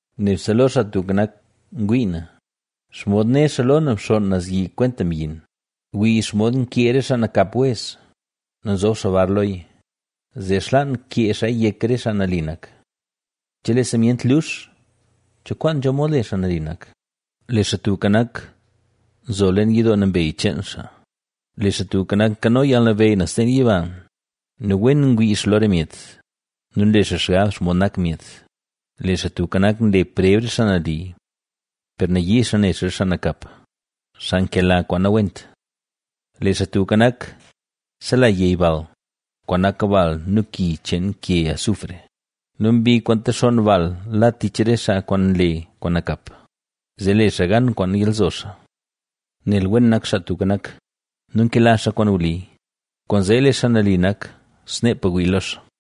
Nebse lo Xaa Tubka Nak ngwii na; ¿xomod né xaa lo na bxonn naz yi kwenta myin? Wii xomod nkee re xaa nakap wez nu nzob xaa bar loya, zee xlaan kee xaaya yek re xaa nali nak. Chelee simyent lux, ¿cho kwaan nzho mod le xaa nali nak? Lee Xaa Tubka Nak, nzo leen yidoo nambey cheen xaa, lee Xaa Tubka Nak, nkano yalnabeyy naz leen yiba nu wen ngwii xaa lo re myet nu nle xaa xgab xomod nak myet. Lee Xaa Tubka Nak, nle preb re xaa nali; per nayii xaa ne xaa re xaa nakap, xaa nkela kwaan nawent. Lee Xaa Tubka Nak, sela yey bal, kwaan nak bal nu ki cheen ke azufre nu mbi kwaan texonn bal la tich re xaa kwaan nle kwaan nakap, zee le xaa gan kwaan nyalzo xaa. Nel wen nak Xaa Tubka Nak, nu nkela xaa kwaan wli, kwaanzee lee xaa nali nak, sneepa wii lo xaa.